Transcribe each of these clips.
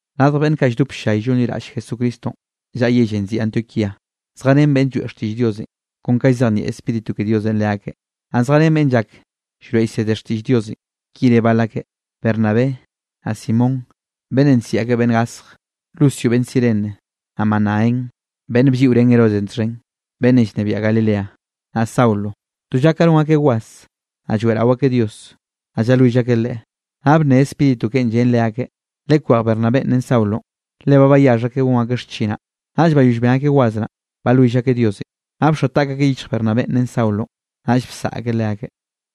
Radj beꞌnn kaꞌ lldop ll-llay llonliraꞌll Jesucristonꞌ llaꞌa yellenꞌ nziꞌi Antioquíanꞌ, zjarén beꞌnn lloeꞌ xtiꞌll Diosenꞌ kon ka llzejnieꞌ Spíritu ke Diosenꞌ leakeꞌ. Naꞌ zjarén beꞌnn llak llroeꞌ llsede xtiꞌll Diosenꞌ, ki re bal akeꞌ: Bernabé, naꞌ Simón (beꞌnnenꞌ nsiꞌi akeꞌ Beꞌnn Gasj), Lucio beꞌnn Cirene, naꞌ Manaén (beꞌnn blliꞌorén Herodesenꞌ txhen, beꞌnnenꞌ llnebiaꞌ Galileanꞌ), naꞌ Saulo. To lla ka non akeꞌ was, naꞌ lloeꞌrao akeꞌ Dios, naꞌ llalwill akeꞌ Leꞌe, naꞌ bnne Spíritu keꞌen llen leakeꞌ: —Lekwej Bernabénꞌ ren Saulonꞌ, le ba bayaxh akeꞌ gon akeꞌ xchinaꞌ. Naꞌll bayoll ben akeꞌ was naꞌ, balwill akeꞌ Diosenꞌ, naꞌ bxoa taꞌk akeꞌ yichj Bernabénꞌ ren Saulonꞌ, naꞌll bsaꞌa akeꞌ leakeꞌ.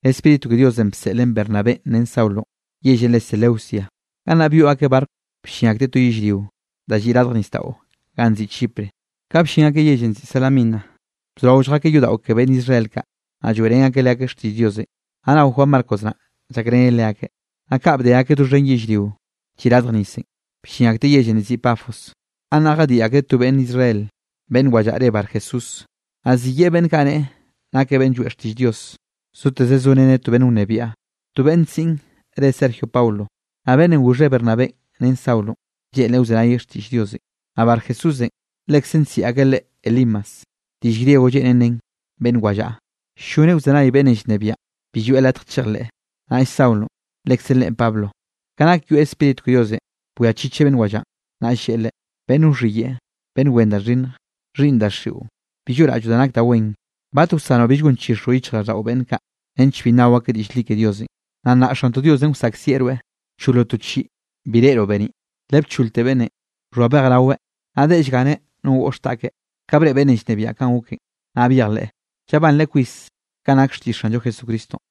Spíritu ke Diosenꞌ bseꞌlen Bernabénꞌ ren Saulonꞌ yellenꞌ re Seleucia, gannaꞌ byoꞌ akeꞌ barco bllin akteꞌ to yellrio, da lliꞌ radj nisdaꞌo ganꞌ nziꞌi Chipre. Ka bllin akeꞌ yellenꞌ nziꞌi Salamina, bzorao lljakeꞌ yodaꞌo ke beꞌnn Israel kaꞌ, naꞌ lloeꞌrén akeꞌ leakeꞌ xtiꞌll Diosenꞌ. Naꞌ nao Juan Marcos naꞌ llakreneꞌ leakeꞌ. Naꞌ kaꞌ bde akeꞌ doxhen yellrionꞌ lliꞌ radj nisenꞌ, bllin akteꞌ yellenꞌ nziꞌi Pafos. Gannaꞌ jadiꞌ akreꞌ to beꞌnn Israel beꞌnn wallaꞌa re Barjesús, naꞌ ziyeꞌe beꞌnn kaꞌ neꞌe nakeꞌ beꞌnn lloeꞌ xtiꞌll Dios. Zoteze zoreneꞌ to beꞌnn wnebiaꞌ, to beꞌnn siꞌn re Sergio Paulo. Naꞌ beꞌnnenꞌ goxheꞌ Bernabénꞌ ren Saulonꞌ, lleꞌnreꞌ wzenayeꞌ xtiꞌll Diosenꞌ. Naꞌ Barjesúsenꞌ, lekze nsiꞌi akeꞌ leꞌe Elimas, (diꞌll griego lleꞌnen nen beꞌnn wallaꞌa), ll-lloneꞌ wzenay beꞌnnenꞌ llnebiaꞌn bi lloeꞌ latj chejleꞌ. Naꞌll Saulonꞌ, lekze leꞌen re Pablonꞌ, ka nak yoeꞌ Spíritu ke Diosenꞌ, bwiachicheꞌ beꞌnn wallaꞌan. Naꞌll lleꞌe leꞌe: —Beꞌnn wxhiyeꞌe, beꞌnn wen da xhinnj, xhiꞌnn daxiꞌo bi lloꞌraꞌlloꞌ da nak da wen. ¿Bat wsanoꞌ bill gonchixroꞌ yichjraꞌlldaꞌo beꞌnn kaꞌ, nench bi nnao akeꞌ diꞌll li ke Diosenꞌ? Naꞌ nnaꞌ Xantoꞌ Diosenꞌ wsaꞌkzieꞌ rweꞌ, wcholoꞌ to chiꞌi bi reꞌroꞌ beniꞌ. Le bcholte beꞌnnenꞌ, bxhoa bej raweꞌ, naꞌ deꞌe llganeꞌ no goꞌx taꞌkeꞌ. Ka breꞌe beꞌnnenꞌ llnebiaꞌn kanꞌ goken naꞌ byejleꞌ, llabanreꞌ kwis kanꞌ nak xtiꞌll Xanllo Jesucristonꞌ.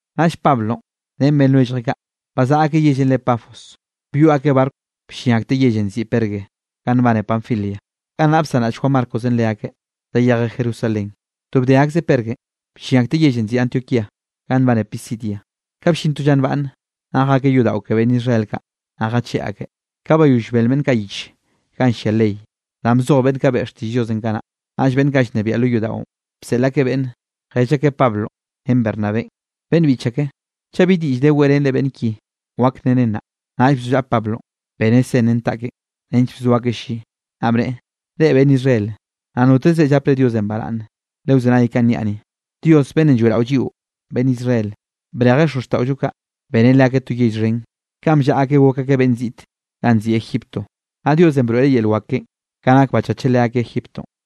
Naꞌll Pablonꞌ ren beꞌnn lwelljeꞌ kaꞌ, bazaꞌa akeꞌ yellenꞌ re Pafos, byoꞌ akeꞌ barco bllin akteꞌ yellenꞌ nziꞌi Perge ganꞌ nbane Panfilia. Gannaꞌ bsanraꞌll Juan Marcos leakeꞌ, zayejeꞌ Jerusalén. To bde akzeꞌ Pergenꞌ, bllin akteꞌ yellenꞌ nziꞌi Antioquía ga nbane Pisidia. Ka bllin to lla nbaꞌnne, naꞌ jakeꞌ yodaꞌo ke beꞌnn Israel kaꞌ, naꞌ jacheꞌ akeꞌ. Ka bayoll bel beꞌnn kaꞌ yich ganꞌ llia ley, danꞌ bzoj beꞌnn kaꞌ beꞌe xtiꞌll Diosenꞌ kanaꞌ, naꞌll beꞌnn kaꞌ llnebiaꞌ lo yodaꞌon, bseꞌl akeꞌ beꞌnn, jell akeꞌ Pablonꞌ ren Bernabénꞌ: —Beꞌnn biꞌch ake, chaꞌ bi diꞌll de weꞌrenre beꞌnn ki wak nnere nnaꞌ. Naꞌll bzollaꞌa Pablonꞌ, beneꞌ sen ren taꞌkeꞌn, nench bzo akeꞌ lli, naꞌ bneꞌe: —Reꞌ, beꞌnn Israel, naꞌ notezre llapre Diosenꞌ baraꞌnne lewzenay kanꞌ niaꞌ ni. Dios beꞌnnenꞌ lloeꞌraollo lliꞌo beꞌnn Israel, brejeꞌ xozxtaꞌollo kaꞌ, beneꞌ leakeꞌ to yell xhen kanꞌ bllaꞌa akeꞌ gok akeꞌ beꞌnn ziꞌt ganꞌ nziꞌi Egiptonꞌ. Naꞌ Diosenꞌ broeꞌreꞌ yel wak keꞌen ka nak bachacheꞌ leakeꞌ Egiptonꞌ.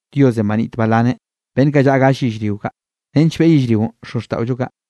Diosenꞌ banit balaneꞌ beꞌnn kaꞌ llaꞌa gall yellrio kaꞌ, nench beꞌe yellrionꞌ xozxtaꞌollo kaꞌ.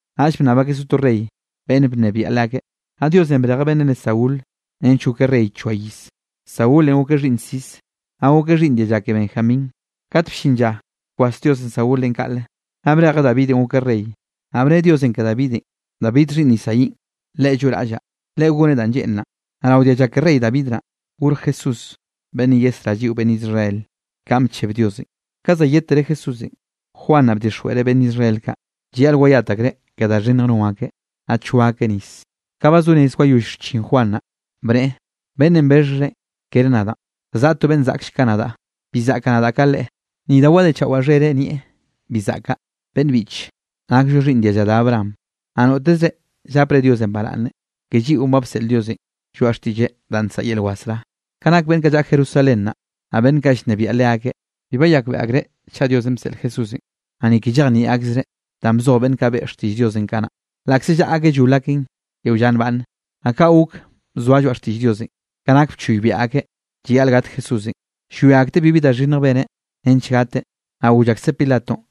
Naꞌll bnnab akeꞌ so rey beꞌnn bnebiaꞌ leakeꞌ, naꞌ Diosenꞌ brejeꞌ beꞌnnenꞌ re Saúl, nench gokeꞌ rey choa iz. Saúlenꞌ gokeꞌ xhiꞌnn Cis, naꞌ gokeꞌ xhiꞌnn dialla ke Benjamín. Kat bllin lla bkwas Diosenꞌ Saúlenꞌ kaꞌle, naꞌ brejeꞌ David gokeꞌ rey, naꞌ bne Diosenꞌ ke Davidenꞌ: “David xhiꞌnn Isaínꞌ, leꞌe lloꞌraꞌllaꞌ, leꞌe goneꞌ danꞌ lleꞌnraꞌn.” Naꞌ rao dialla ke rey David naꞌ, gorj Jesús beꞌnnenꞌ yesrá lliꞌo beꞌnn Israel, kanꞌ bcheb Diosenꞌ. Ka zayedtere Jesúsenꞌ, Juan naꞌ bdixjweꞌreꞌ beꞌnn Israel kaꞌ, llayaꞌl wayat akreꞌ ke da xhinnjenꞌ non akeꞌ, naꞌ choa akeꞌ nis. Ka ba zo rez wayoll xchin Juan naꞌ, bneꞌe: “Beꞌnnenꞌ bexhrenꞌ kere nadaꞌ, za zaꞌa to beꞌnn zaꞌkll ka nadaꞌ, bi zaꞌkaꞌ nadaꞌ ka Leꞌe, ni da wadechaꞌwaꞌ xhereꞌn nieꞌ, bi zaꞌkaꞌ.” ’Beꞌnn biꞌche, nakllo xhiꞌnn dialla da Abraham, naꞌ notezre llapre Diosenꞌ baraꞌnne, ke lliꞌon ba bseꞌl Diosenꞌ lloaꞌ xtiꞌlleꞌ danꞌ nsaꞌa yel wasrá. Ka nak beꞌnn kaꞌ llaꞌa Jerusalén naꞌ, naꞌ beꞌnn kaꞌ llnebiaꞌ leakeꞌ, bi bayakbeꞌe akreꞌ chaꞌ Diosenꞌ bseꞌl Jesúsenꞌ, naꞌ ni ke llejnieꞌ akzreꞌ danꞌ bzoj beꞌnn kaꞌ beꞌe xtiꞌll Diosenꞌ kanaꞌ, laꞌkze llaꞌa akeꞌ llol akeꞌn yeo lla nbaꞌnne. Naꞌ kaꞌ gok bzoa lloaꞌ xtiꞌll Diosenꞌ ka nak bchoybiaꞌ akeꞌ llayaꞌl gat Jesúsenꞌ. Llwia akteꞌ bibi da xhinnj beneꞌ nench gateꞌ, naꞌ goll akseꞌ Pilatonꞌ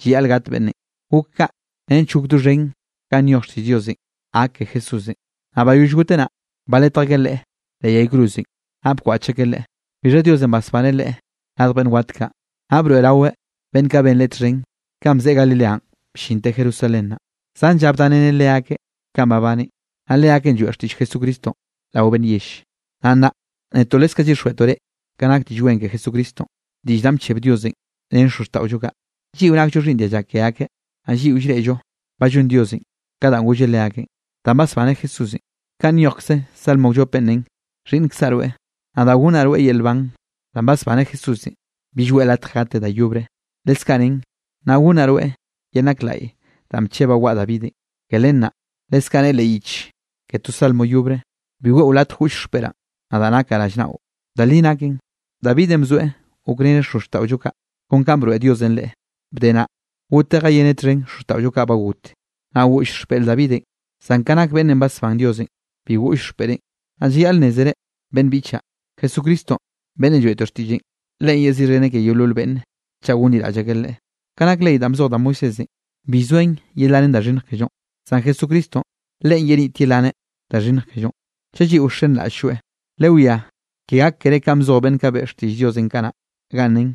llayaꞌl gat beꞌnnenꞌ. Gok kaꞌ nench gok doxhen kanꞌ nyoj xtiꞌll Diosenꞌ gak ke Jesúsenꞌ. Naꞌ bayoll goteꞌ naꞌ, baletj akeꞌ Leꞌe leꞌ yay cruzenꞌ, naꞌ bkwaꞌch akeꞌ Leꞌe. Bixha Diosenꞌ basbaneꞌ Leꞌe radj beꞌnn wat kaꞌ. Naꞌ broeꞌraweꞌ beꞌnn kaꞌ ben Leꞌe txhen kanꞌ bzeꞌe Galileanꞌ bllinteꞌ Jerusalén naꞌ, zan lla bdareneꞌ leakeꞌ kanꞌ babaneꞌn. Naꞌ leakeꞌn lloeꞌ xtiꞌll Jesucristonꞌ rao beꞌnn yell. ’Naꞌ nnaꞌ netoꞌ leskaꞌ llyixjweꞌtoꞌ reꞌ kanꞌ nak Diꞌll Wen ke Jesucristonꞌ, diꞌll danꞌ bcheb Diosenꞌ ren xozxtaꞌollo kaꞌ. Lliꞌo nakllo xhiꞌnn dialla ke akeꞌ, naꞌ lliꞌo llreꞌllo ba llon Diosenꞌ ka danꞌ golleꞌ leakeꞌn, danꞌ basbaneꞌ Jesúsenꞌ. Kanꞌ nyojkze salmo wllopenꞌ nen: “Xhiꞌnnkzaꞌ rweꞌ, nadaꞌ gonnaꞌ rweꞌ yel nban.” Danꞌ basbaneꞌ Jesúsenꞌ, bill weꞌe latj gateꞌ da yobre, leskaꞌ nen: “Naꞌ gonnaꞌ rweꞌ yel nak laꞌye danꞌ bchebaꞌ waꞌa Davidenꞌ.” Ke len naꞌ leskaꞌ ne leꞌ yich ke to salmo yobre: “Bi weꞌo latj goꞌll xpeꞌraꞌn, nadaꞌ nakaꞌ rallnaꞌo.” Da li naken, Davidenꞌ bzoeꞌ gokreneꞌ xozxtaꞌollo kaꞌ kon ka broeꞌ Diosenꞌ leꞌe. Bde naꞌ, goteꞌ jayeneꞌ txhen xozxtaꞌollo kaꞌ ba got, naꞌ goꞌll xpeꞌr Davidenꞌ. Zan ka nak beꞌnnenꞌ basbán Diosenꞌ, bi goꞌll xpeꞌreꞌn. Naꞌ llayaꞌl nnézere, beꞌnn biꞌchaꞌ, Jesucristonꞌ beꞌnnenꞌ lloeꞌtoꞌ xtiꞌlleꞌn, Leꞌe yeziꞌxheneꞌ ke yeolol beꞌnne chaꞌ gonliraꞌll akeꞌ Leꞌe. Ka nak ley danꞌ bzoj da Moisésenꞌ, bi llzoen yelanen da xhinnj kellonꞌ, zan Jesucristonꞌ Leꞌen yenit yelaneꞌ da xhinnj kellonꞌ, chaꞌ lliꞌo wxenraꞌll-lloeꞌ. Lewiá, ke gak keré kanꞌ bzoj beꞌnn kaꞌ beꞌe xtiꞌll Diosenꞌ kanaꞌ, ganꞌ nen: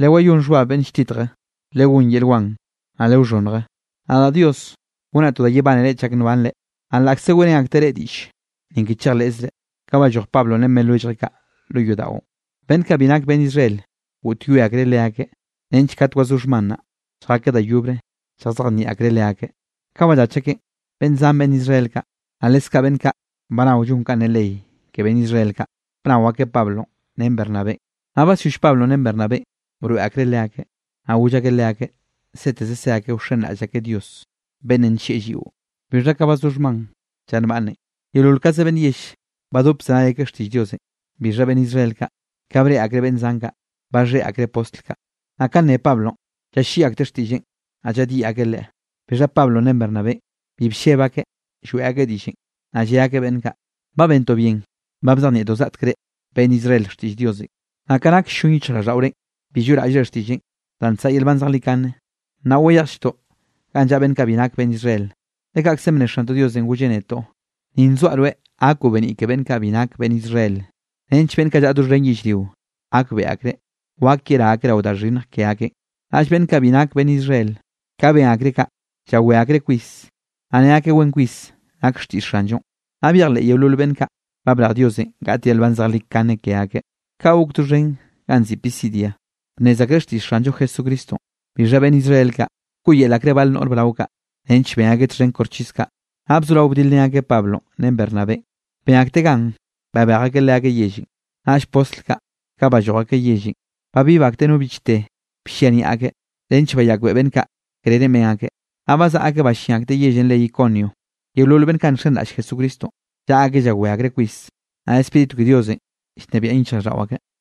Lewayón xhbab beꞌnn lltitje, Legón yel wan, naꞌ lewxhonnje. Nadaꞌ Dios gonaꞌ to da yebánere chak nbanre, naꞌ laꞌkze weꞌrén akteꞌ reꞌ diꞌll, ni ke chejleꞌzre. Ka balloj Pablonꞌ ren beꞌnn lwelljeꞌ kaꞌ lo yodaꞌon, beꞌnn kaꞌ bi nak beꞌnn Israel goꞌtyoe akreꞌ leakeꞌ, nench kat wazó xhman naꞌ, lljakeꞌ da yobre lljazejnieꞌ akreꞌ leakeꞌ. Ka ballach akeꞌn, beꞌnn zan beꞌnn Israel kaꞌ, naꞌ leskaꞌ beꞌnn kaꞌ ba nao llon kanꞌ ne ley ke beꞌnn Israel kaꞌ, bnao akeꞌ Pablonꞌ ren Bernabénꞌ. Naꞌ basyoll Pablonꞌ ren Bernabénꞌ broeꞌ akreꞌ leakeꞌ, naꞌ goll akeꞌ leakeꞌ seteze se akeꞌ wxenraꞌll akeꞌ Dios, beꞌnnenꞌ nllieꞌ lliꞌo. Bixha ka bazó xhman lla nbaꞌnne, yeolol kaze beꞌnn yell badop bzenay akeꞌ xtiꞌll Diosenꞌ. Bixha beꞌnn Israel kaꞌ, ka breꞌe akreꞌ beꞌnn zan kaꞌ, baxhéꞌ akreꞌ postl kaꞌ, naꞌ ka nne Pablonꞌ, llalliꞌi akteꞌ xtiꞌlleꞌn, naꞌ llaꞌdyiꞌ akeꞌ leꞌe. Bixha Pablonꞌ ren Bernabénꞌ bi lleb akeꞌ lloeꞌ akeꞌ diꞌllenꞌ, naꞌ lle akeꞌ beꞌnn kaꞌ: —Ba bentoꞌ bien ba bzejnieꞌtoꞌ zgaꞌtek reꞌ beꞌnn Israel xtiꞌll Diosenꞌ, naꞌ ka nak ll-llon yichjraꞌlldaꞌore, bi lloꞌraꞌllre xtiꞌlleꞌ danꞌ nsaꞌa yel nban zejlikane, naꞌ wayejlltoꞌ ganꞌ llaꞌa beꞌnn kaꞌ bi nak beꞌnn Israel. Le kaꞌkzenꞌ bne Xantoꞌ Diosenꞌ golleꞌ netoꞌ: Ni nzoaꞌ rweꞌ gakoꞌ beniꞌ ke beꞌnn kaꞌ bi nak beꞌnn Israel, nench beꞌnn kaꞌ llaꞌa doxhen yellrio, gakbeꞌe akreꞌ wak yerá akeꞌ rao da xhinnj ke akeꞌn. Naꞌll beꞌnn kaꞌ bi nak beꞌnn Israel, ka ben akreꞌ kaꞌ, llawé akreꞌ kwis, naꞌ ne akeꞌ wen kwis nak xtiꞌll Xanllo. Naꞌ byejleꞌ yeolol beꞌnn kaꞌ ba brej Diosenꞌ gaꞌt yel nban zejlikane ke akeꞌ. Kaꞌ gok, doxhen ganꞌ nziꞌi Pisidia, bnnez akreꞌ xtiꞌll Xanllo Jesucristonꞌ. Bixha beꞌnn Israel kaꞌ, bkoꞌyel akreꞌ bal noꞌr brao kaꞌ, nench ben akeꞌ txhen koxchis kaꞌ, naꞌ bzorao bdilrén akeꞌ Pablonꞌ ren Bernabénꞌ, ben akteꞌ gan babej akeꞌ leakeꞌ yellenꞌ. Naꞌll postl kaꞌ balloj akeꞌ yellenꞌ, babib akteꞌ no bichte bllia niaꞌ akeꞌ, nench bayakbeꞌe beꞌnn kaꞌ krerenꞌ ben akeꞌ. Naꞌ bazaꞌa akeꞌ ballín akteꞌ yellenꞌ re Iconio. Yeolol beꞌnn kaꞌ nxenraꞌll Jesucristonꞌ, llaꞌa akeꞌ llawé akreꞌ kwis, naꞌ Spíritu ke Diosenꞌ llnebiaꞌn yichjraꞌlldaꞌo akeꞌ.